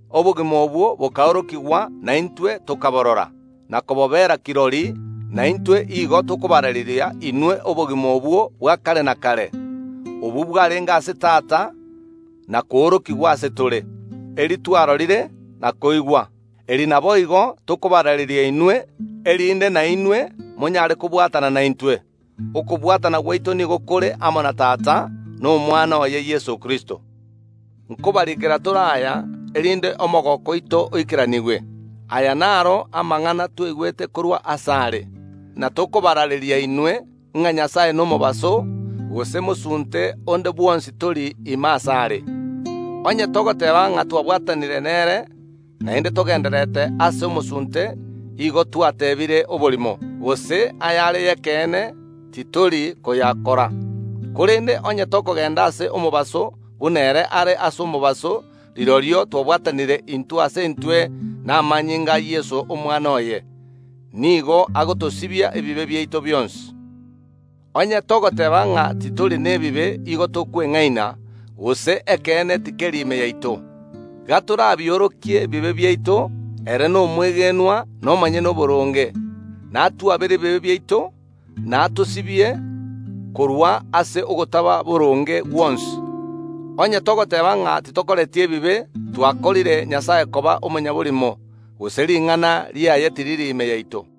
Obogima obwo bokaorokigwa, na intwe tokaborora na kobobera kirori; na intwe igo tokabaraareria inwe obogima obwo bwa kare na kare, obwo bwarenge ase Tata na koorokigwa ase tore. Eri twarorire na koigwa, eri naboigo tokobaraareria inwe, erinde nainwe monyare kobwatana naintwe. Okobwatana gwaito nigo kore amo na Tata na Omwana oye Yeso Kristo. Nkobariikera tore aya, erinde omogooko oito oikeranigwe. Aya naro amang’ana twaigwete korwa asare, na tokobaraareria inwe, ng’a Nyasae nomobaso, gose mosunte onde bwonsi tori ime asare. Onye togoteeba ng’a twabwatanire nere, naende togendererete ase omosunte, igo twatebiire oborimo, gose ayare ay’ekeene titori koyakora. Korende onye tokogenda ase omobaso, buna ere are ase omobaso, rirorio twabwatanire intwe ase intwe, na amanyinga a Yeso, Omwana oye, nigo agotosibia ebibe biaito bionsi. Onye togoteeba ng’a titori na bibe, iga tokweng’aina, gose ekeene tikeri ime yaito. Gatorabiorokie ebibe biaito, ere nomwegenwa na omonyene oboronge, natwabere ebibe biaito, na atosibie korwa ase ogotaba boronge gwonsi. Onye togoteeba ng’a titokoreti ebibe, twakorire Nyasae koba omonyaborimo, gose ring’ana riaye tiriri ime yaito.